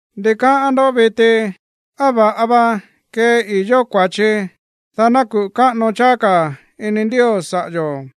¿Ndi káꞌán ndó viti? ¿Á va̱ꞌa va kee ii̱ yó kua̱chi, dá ná kuꞌu̱ káꞌano cháá ka̱ ini Ndios saꞌa̱ yo̱?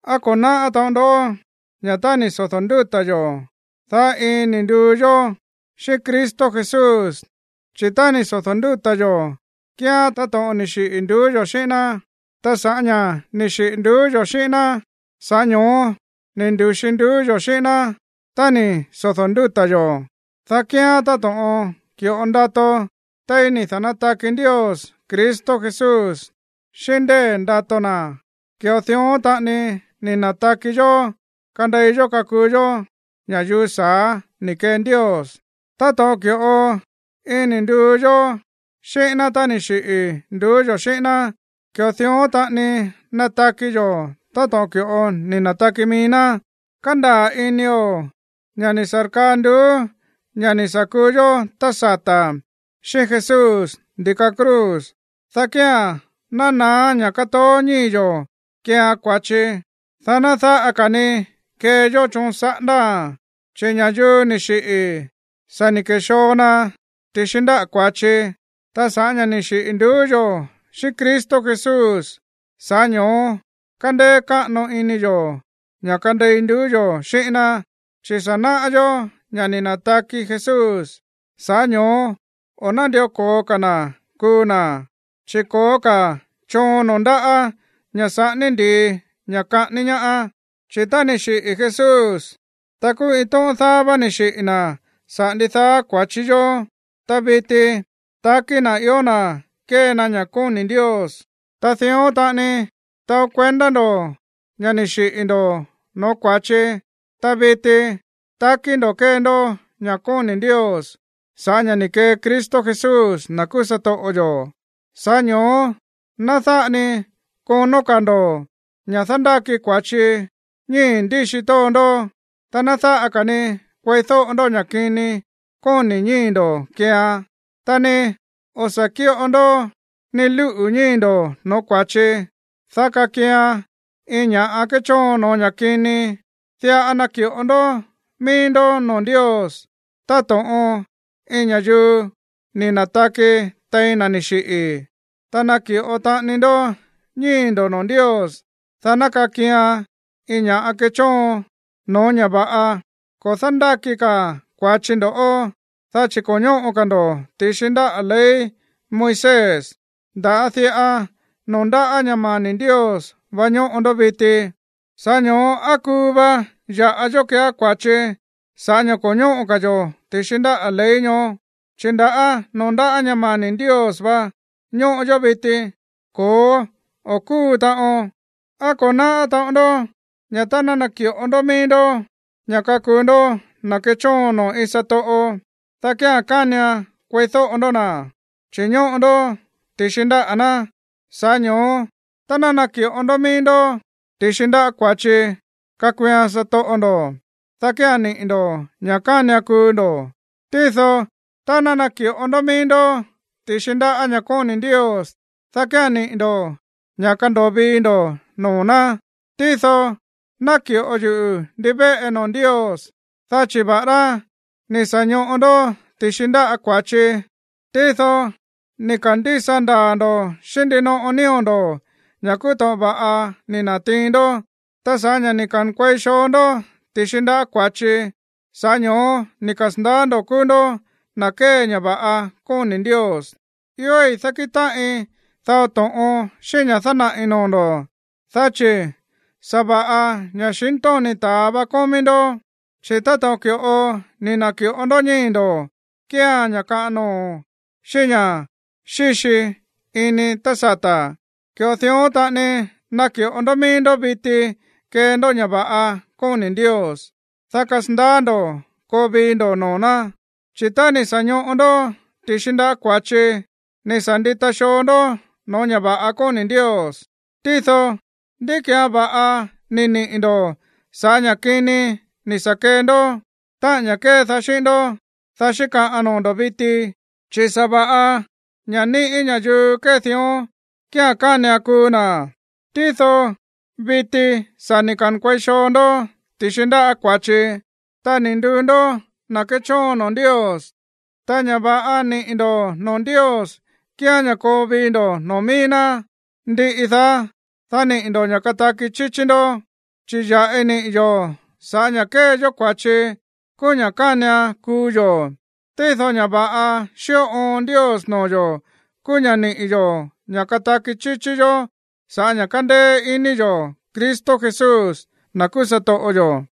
¿Á ko̱ náꞌá taꞌon ndó ña̱ tá ni̱ sodo̱ ndúta̱ yo̱, dá iin ni̱ nduu yó xíꞌín Cristo Jesús? Chi̱ tá ni̱ sodo̱ ndúta̱ yo̱ kíán táto̱ꞌon ni̱ xiꞌi̱ nduú yo̱ xíꞌín ná. Ta sa̱ꞌá ña̱ ni̱ xiꞌi̱ nduú yo̱ xíꞌín ná, sa̱ꞌá ño̱ó ni̱ ndu̱xi nduú yo̱ xíꞌín ná tá ni̱ sodo̱ ndúta̱ yo̱. Dá kíán, táto̱ꞌon ki̱ꞌo ndato téí ni̱ da̱nátaki Ndios Cristo Jesús xíꞌín ndée̱ ndato na̱, ki̱ꞌo dión taꞌani ni̱ na̱taki yo̱ kandei yó kakuu yó ña̱yuu sa̱á ni̱ kee Ndios. Táto̱ꞌon ki̱ꞌo iin ni̱ nduu yó xíꞌín ná tá ni̱ xiꞌi̱ nduú yo̱ xíꞌín ná, ki̱ꞌo dión taꞌani nataki yo̱ táto̱ꞌon ki̱ꞌo ni̱ na̱taki mií ná. Kándaa̱ inio̱ ña̱ ni̱ sa̱rkaa nduú ña̱ ni̱ sa̱ kuu yó tá sata̱ xíꞌín Jesús ndi̱ka cruz, dá kía̱n ná naá ña̱ kátoó ñíi̱ yo̱ keean kua̱chi, dá ná dáꞌa ka̱ ni kee yó choon saꞌándáa̱n. Chi̱ ña̱yuu ni̱ xiꞌi̱, sa̱ ni̱ ke̱xoo na ti̱xi ndáꞌa̱ kua̱chi. Ta sa̱ꞌá ña̱ ni̱ xiꞌi̱ nduú yo̱ xíꞌín Cristo Jesús, sa̱ꞌá ño̱ó kándéé káꞌano iní yo̱ ña̱ kandei nduú yo̱ xíꞌín ná. Chi̱ sa̱ náꞌá yó ña̱ ni̱ na̱taki Jesús, sa̱ꞌá ño̱ó o̱ nándió ko̱o ka̱ na̱ kuu na̱, chi̱ ko̱ó ka̱ choon noo̱ ndaꞌá ña̱ saꞌání ndi̱i ña̱ kaꞌání ñaá. Chi̱ tá ni̱ xiꞌi̱ Jesús, ta kúú iin tóꞌón dáá vá ni̱ xiꞌi̱ na̱ saꞌa̱ ndidaá kua̱chi yó. Ta viti takí na̱ ió na̱ kée na ña̱ kóni̱ Ndios. Ta dión taꞌani taó kuendá ndo̱ ña̱ ni̱ xiꞌi̱ ndo̱ no̱ó kua̱chi, ta viti takí ndo̱ kée ndó ña̱ kóni̱ Ndios sa̱ꞌá ña̱ ni̱ kee Cristo Jesús, na̱ kúú satoꞌo yo̱. Sa̱ꞌá ño̱ó ná dáꞌa ni konó ka̱ ndo̱ ña̱ dándáki kua̱chi ñíi̱ ndíxi tóo ndó. Ta ná dáꞌa ka̱ ni kueídóꞌo ndó ña̱ kini kóni̱ ñíi̱ ndo̱ keean. Ta ni o̱ sa̱ kíꞌo ndó ni lúꞌu̱ ñíi̱ ndo̱ no̱ó kua̱chi, dá kakian iin ña̱ꞌa kéchóon no̱ó ña̱ kini. Diꞌa naki̱ꞌo ndó míí ndó noo̱ Ndios táto̱ꞌon iin ña̱yuu ni̱ na̱taki tein na̱ ni̱ xiꞌi̱. Ta naki̱ꞌo taꞌani ndó ñíi̱ ndo̱ noo̱ Ndios, dá ná kakian iin ña̱ꞌa kéchóon no̱ó ña̱ va̱ꞌa. Ko̱ dándáki ka̱ kua̱chi ndoꞌó, dá chi̱ ko̱ ñóꞌo ka̱ ndo̱ ti̱xi ndáꞌa̱ ley Moisés, nda̱á diꞌa noo̱ ndáꞌa̱ ña̱ mani̱ Ndios vá ñóꞌo ndó viti. Sa̱ꞌá ño̱ó, ¿á kuu va ya̱ꞌa yó keeá kua̱chi sa̱ꞌá ña̱ ko̱ ñóꞌo ka̱ yo̱ ti̱xi ndáꞌa̱ ley ñoó, chi̱ nda̱á noo̱ ndáꞌa̱ ña̱ mani̱ Ndios vá ñóꞌo yó viti? Ko̱ó, o̱ kúu taꞌon. ¿Á ko̱ náꞌá taꞌon ndó ña̱ tá naki̱ꞌo ndó mií ndó ña̱ kakuu ndó na̱ kéchóon noo̱ iin satoꞌo, dá kía̱n kánian kueídóꞌo ndó na̱, chi̱ ñóꞌo ndó ti̱xi ndáꞌa̱ ná? Sa̱ꞌá ño̱ó tá ná naki̱ꞌo ndó mií ndó ti̱xi ndáꞌa̱ kua̱chi kakuuan satoꞌo ndo̱, dá kía̱n niꞌi̱ ndo̱ ña̱ kánian kuu ndo̱. Tído, tá ná naki̱ꞌo ndó mií ndó ti̱xi ndáꞌa̱ ña̱ kóni̱ Ndios, dá kía̱n niꞌi̱ ndo̱ ña̱ kando̱o vii ndo̱ noo̱ ná. Tído náki̱ꞌo yuꞌu̱ ndivéꞌe noo̱ Ndios, dá chi̱ va̱ꞌará ni̱ sa̱ ñoꞌo ndó ti̱xi ndáꞌa̱ kua̱chi, tído ni̱ ka̱ndísa ndaa̱ ndo̱ xíꞌín ndinoꞌo nío̱ ndo̱ ña̱ kúú to̱ꞌon va̱ꞌa ni̱ na̱tiin ndó. Ta sa̱ꞌá ña̱ ni̱ ka̱nkuei xoo ndó ti̱xi ndáꞌa̱ kua̱chi, sa̱ꞌá ño̱ó ni̱ kasa̱ndaá ndo̱ kúú ndó na̱ kée ña̱ va̱ꞌa kóni̱ Ndios. Iói̱ dákíꞌin táꞌin dao to̱ꞌon xíꞌín ña̱ dánaꞌi̱ noo̱ ndo̱, dá chi̱ sa̱va̱ꞌa ña̱xintóni̱ ta̱a va kómí ndó. Chi̱ táto̱ꞌon ki̱ꞌo ni̱ na̱ki̱ꞌo ndó ñíi̱ ndo̱ keean ña̱ kaꞌan noo̱ xíꞌín ña̱ xíxi ini tá sata̱, ki̱ꞌo dión taꞌani naki̱ꞌo ndó mií ndó viti kee ndó ña̱ va̱ꞌa kóni̱ Ndios, dá kasandaá ndo̱ koo vii ndo̱ noo̱ ná. Chi̱ tá ni̱ sa̱ ñoꞌo ndó ti̱xi ndáꞌa̱ kua̱chi, ni̱ sa̱ ndita xoo ndó no̱ó ña̱ va̱ꞌa kóni̱ Ndios. Tído, ¿ndí ki̱án va̱ꞌa ni̱ niꞌi̱ ndo̱ sa̱ꞌá ña̱ kini ni̱ sa̱ kee ndó, táꞌa̱n ña̱ kédaá xíꞌín ndó, dá xíkaꞌan noo̱ ndo̱ viti? Chi̱ sa̱va̱ꞌa ña̱ niꞌi̱ ña̱yuu kée dión kía̱n kánian kuu na̱. Tído viti sa̱ ni̱ ka̱nkuei xoo ndó ti̱xi ndáꞌa̱ kua̱chi, ta ni̱ nduu ndó na̱ kéchóon noo̱ Ndios. Ta ña̱ va̱ꞌa niꞌi̱ ndo̱ noo̱ Ndios kía̱n ña̱ koo vii ndo̱ noo̱ míí ná, ndiꞌi daá, dá niꞌi̱ ndo̱ ña̱ kataki chíchí ndó. Chi̱ ya̱ꞌi niꞌi̱ yo̱ sa̱ꞌá ña̱ kée yó kua̱chi kúú ña̱ kánian kuu yo̱. Tído ña̱ va̱ꞌa xíꞌo oon Ndios noo̱ yo̱ kúú ña̱ niꞌi̱ yo̱ ña̱ kataki chíchí yó sa̱ꞌá ña̱ kándéé iní yo̱ Cristo Jesús, na̱ kúú satoꞌo yo̱.